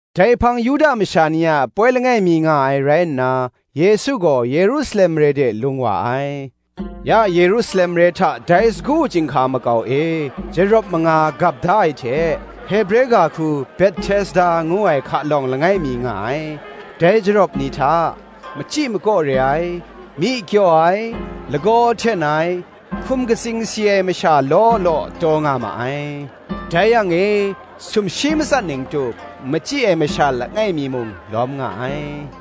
Dai hpang Yuda masha ni a poi langai mi nga ai rai nna, Yesu gaw Yerusalem mare de lung wa ai. Ya Yerusalem mare hta dai sagu chyinghka makau e, jarawp manga gap da ai hte, Hebre ga hku Behtesda ngu ai hka lawng langai mi nga ai. Dai jarawp ni hta, machyi makaw re ai, myi kyaw ai, lagaw hten ai, hkum katsing si ai masha law law taw nga ma ai. Dai yang e sumshi matsat ning tup machyi ai masha langai mi mung lawm nga ai.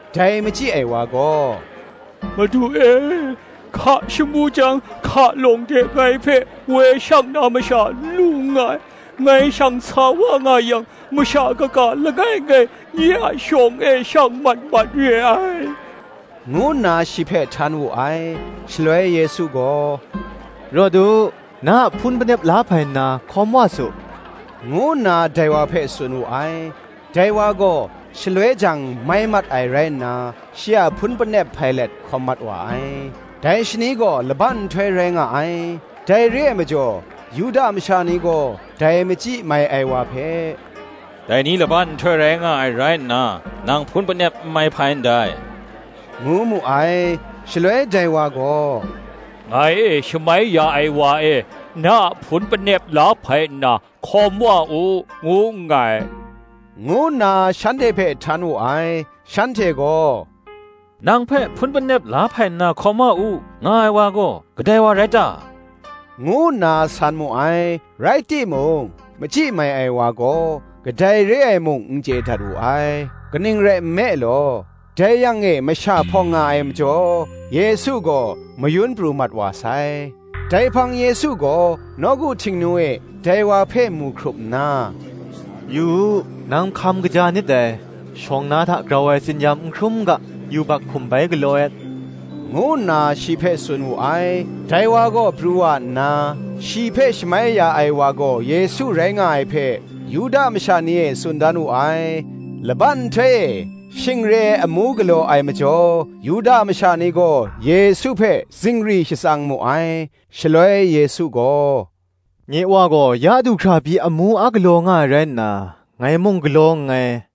Dai machyi ai wa gaw, “Madu e, hka shamu jang hka lawng de ngai hpe woi shang na masha n lu nngai; ngai shang sa wa nga yang, masha kaga langai ngai nye a shawng e shang mat mat re ai,” ngu nna shi hpe htan wu ai. Shaloi Yesu gaw, “Rawt u, na a hpun panep la hpai nna hkawm wa su,” ngu nna dai wa hpe tsun wu ai. Dai wa gaw shaloi jang mai mat ai rai nna, shi a hpun panep hpai let hkawm mat wa ai. Dai shani gaw laban nhtoi rai nga ai. Dai re ai majaw Yuda masha ni gaw, dai machyi mai ai wa hpe, “Dai ni laban nhtoi rai nga ai rai nna, nang hpun panep n mai hpai ndai,” ngu mu ai. Shaloi dai wa gaw, “Ngai e shamai ya ai wa e, ‘Na a hpun panep la hpai nna hkawm wa u,’ ngu nngai,” ngu nna shanhte hpe htan wu ai. Shanhte gaw, “Nang hpe, ‘Hpun Panep la hpai nna hkawm wa u,’ nga ai wa gaw, kadai wa rai ta?” ngu nna san mu ai. Rai timung, machyi mai ai wa gaw, kadai re ai mung n chye dat wu ai: kaning rai nme law, dai yang e masha hpawng nga ai majaw, Yesu gaw mayun pru mat wa sai. Dai hpang Yesu gaw nawku Htingnu e dai wa hpe mu hkrup nna, “Yu u, nang ya hkam kaja nit dai: shawng na hta grau ai tsin-yam n hkrum n ga, yubak hkum bai galaw et,” ngu nna shi hpe tsun wu ai. Dai wa gaw pru wa nna, shi hpe shamai ya ai wa gaw Yesu rai nga ai hpe, Yuda masha ni e tsun dan wu ai. Laban nhtoi e shing re ai amu galaw ai majaw, Yuda masha ni gaw Yesu hpe zingri shatsang mu ai. Shaloi Yesu gaw, “Nye Wa gaw ya du hkra pyi amu a galaw nga ai rai nna, ngai mung galaw nngai,”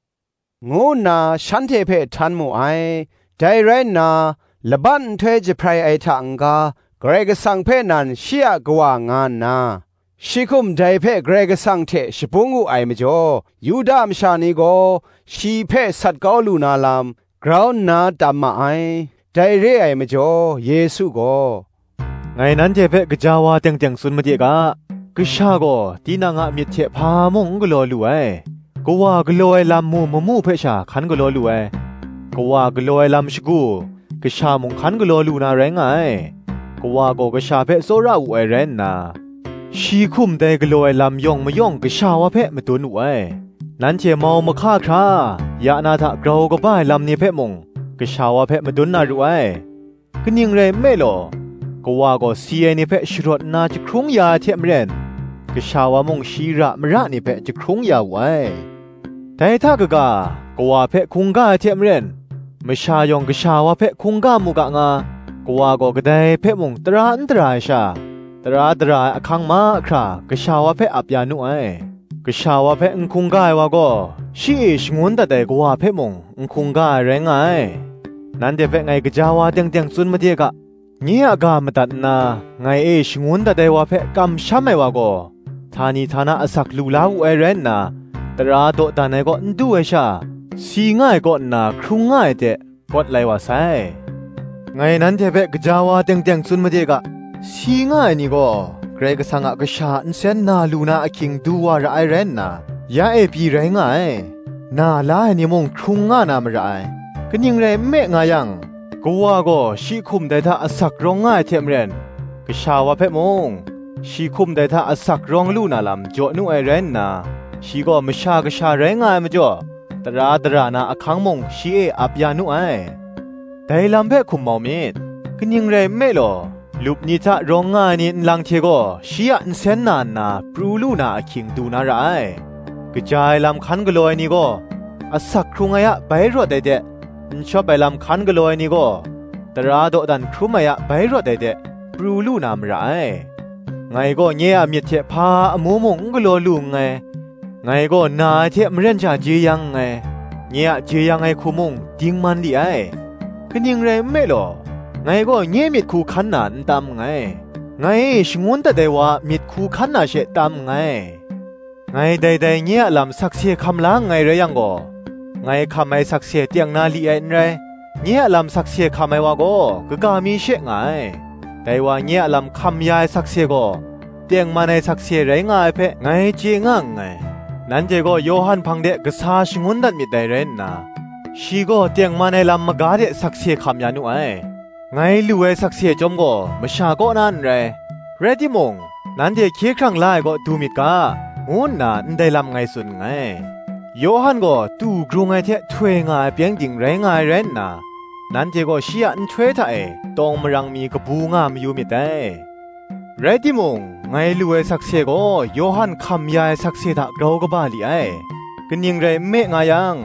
ngu nna shanhte hpe htan mu ai. Dai rai nna, laban nhtoi jahprai ai hta n-ga, Karai Kasang hpe nan shi a Kawa nga nna, shi hkum dai hpe Karai Kasang hte shabung wu ai majaw, Yuda masha ni gaw shi hpe sat kau lu na lam, grau nna tam ma ai. Dai re ai majaw Yesu gaw, “Ngai nanhte hpe gaja wa teng teng tsun made ga, Kasha gaw tinang a myit hte hpa mung n galaw lu ai; Kawa galaw ai lam mu mamu hpe sha hkan galaw lu ai: Kawa galaw ai lam shagu, Kasha mung hkan galaw lu na rai nga ai. Kawa gaw Kasha hpe tsawra wu ai rai nna, shi hkum dai galaw ai lam yawng mayawng Kasha wa hpe madun wu ai: nanhte mau mahka hkra, ya na hta grau kaba ai lam ni hpe mung, Kasha wa hpe madun na ru ai. Kaning rai nme law, Kawa gaw si ai ni hpe sharawt nna jahkrung ya ai hte maren, Kasha wa mung shi ra mara ni hpe jahkrung ya wu ai. Dai hta kaga, Kawa hpe hkungga ai hte maren, masha yawng Kasha wa hpe hkungga mu ga nga, Kawa gaw kadai hpe mung tara n dara ai sha, tara dara ai ahkang mahkra Kasha wa hpe ap ya nu ai. Kasha wa hpe n hkungga ai wa gaw, shi e shangun dat ai Kawa hpe mung n hkungga ai rai nga ai. Nanhte hpe ngai gaja wa teng teng tsun made ga, Nye a ga madat nna ngai e shangun dat ai wa hpe kamsham ai wa gaw, htani htana asak lu la wu ai rai nna, tara dawdan ai kaw n du ai sha, si nga ai kaw nna hkrung nga ai de, kawt lai wa sai. Ngai nanhte hpe gaja wa teng teng tsun made ga, Si nga ai ni gaw, Karai Kasang a Kasha a nsen na lu na ahkying du wa ra ai rai nna, ya e pyi rai nga ai: na la ai ni mung hkrung nga na mara ai. Kaning rai nme nga yang, Kawa gaw shi hkum dai hta asak rawng nga ai hte maren, Kasha wa hpe mung, shi hkum dai hta asak rawng lu na lam jaw nu ai rai nna, shi gaw Masha Kasha rai nga ai majaw, tara dara na ahkang mung shi e ap ya nu ai. Dai lam hpe hkum mau myit: kaning rai nme law, lup ni hta rawng nga ai ni nlang hte gaw shi a nsen na nna, pru lu na ahkying du na ra ai: kaja ai lam hkan galaw ai ni gaw, asak hkrung ai a bai rawt ai de, n shawp ai lam hkan galaw ai ni gaw, tara dawdan hkrum ai a bai rawt ai de, pru lu na mara ai. Ngai gaw nye a myit hte hpa amu mung n galaw lu nngai: ngai gaw na ai hte maren sha jeyang nngai; nye a jeyang ai hku mung dingman li ai: kaning rai nme law, ngai gaw nye myit hku hkan na n tam nngai, ngai e shangun dat ai wa a myit hku hkan na she tam nngai. Ngai dai nye a lam sakse hkam la nngai rai yang gaw, ngai hkam ai sakse teng na li ai n rai. Nye a lam sakse hkam ai wa gaw, kaga mi she nga ai: dai wa nye a lam hkam ya ai sakse gaw, tengman ai sakse rai nga ai hpe, ngai chye nga nngai. Nanhte gaw Yawhan hpang de kasa shangun dat myit dai rai nna, shi gaw tengman ai lam maga de sakse hkam ya nu ai. Ngai lu ai sakse chyawm gaw masha kaw na n rai: rai timung, nanhte hkye hkrang la ai kaw du myit ga, ngu nna ndai lam ngai tsun nngai. Yawhan gaw tu grung ai hte htoi nga ai pyengdin rai nga ai rai nna, nanhte gaw shi a ahtoi hta e, tawng marang mi kabu nga mayu myit dai. Rai timung, ngai lu ai sakse gaw Yawhan hkam ya ai sakse hta grau kaba li ai: kaning rai nme nga yang,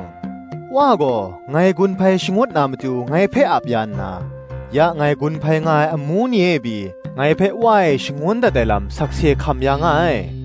Wa gaw, ngai gun hpai shangut na matu ngai hpe ap ya nna, ya ngai gun hpai nga ai amu ni e pyi, ngai hpe Wa e shangun dat ai lam sakse hkam ya nga ai.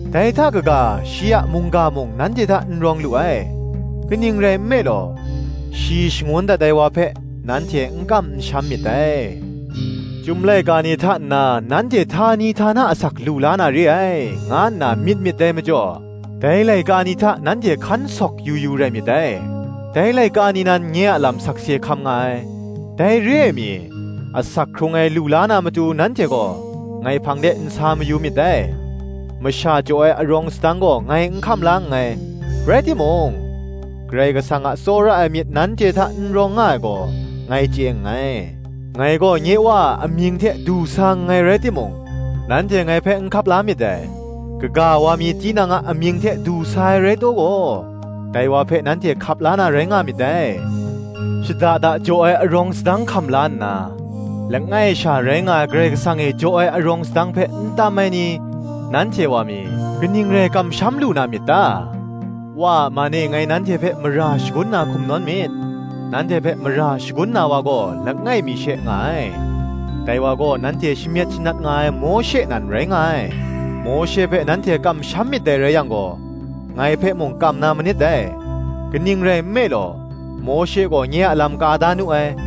dai hta kaga shi a mungga mung nanhte hta n rawng lu ai: kaning rai nme law, shi shangun dat ai wa hpe, nanhte n kam n sham myit dai. Chyum laika ni hta nna nanhte htani htana asak lu la na re ai, nga nna myit myit dai majaw, dai laika ni hta nanhte hkan sawk yu yu rai myit dai: dai laika ni nan nye a lam sakse hkam nga ai: dai re ai mi, asak hkrung ai lu la na matu nanhte gaw ngai hpang de n sa mayu myit dai. Masha jaw ai arawng sadang gaw ngai n hkam la nngai: rai timung, Karai Kasang a tsawra ai myit nanhte hta n rawng nga ai gaw, ngai chye nngai. Ngai gaw nye Wa a amying hte du sa nngai rai timung, nanhte ngai hpe n hkap la myit dai; kaga wa mi tinang a amying hte du sa ai rai taw gaw, dai wa hpe nanhte hkap la na rai nga myit dai. Shada da jaw ai arawng sadang hkam la nna, langai sha rai nga ai Karai Kasang e jaw ai arawng sadang hpe n tam ai ni, nanhte wa mi, kaning rai kamsham lu na myit ta? Wa a man e ngai nanhte hpe mara shagun na hkum nawn myit; nanhte hpe mara shagun na wa gaw langai mi she nga ai; dai wa gaw, nanhte shamyet shanat nga ai Mawshe nan rai nga ai. Mawshe hpe nanhte kam myit dai rai yang gaw, ngai hpe mung kam na manit dai: kaning rai nme law, Mawshe gaw nye a lam ka da nu ai.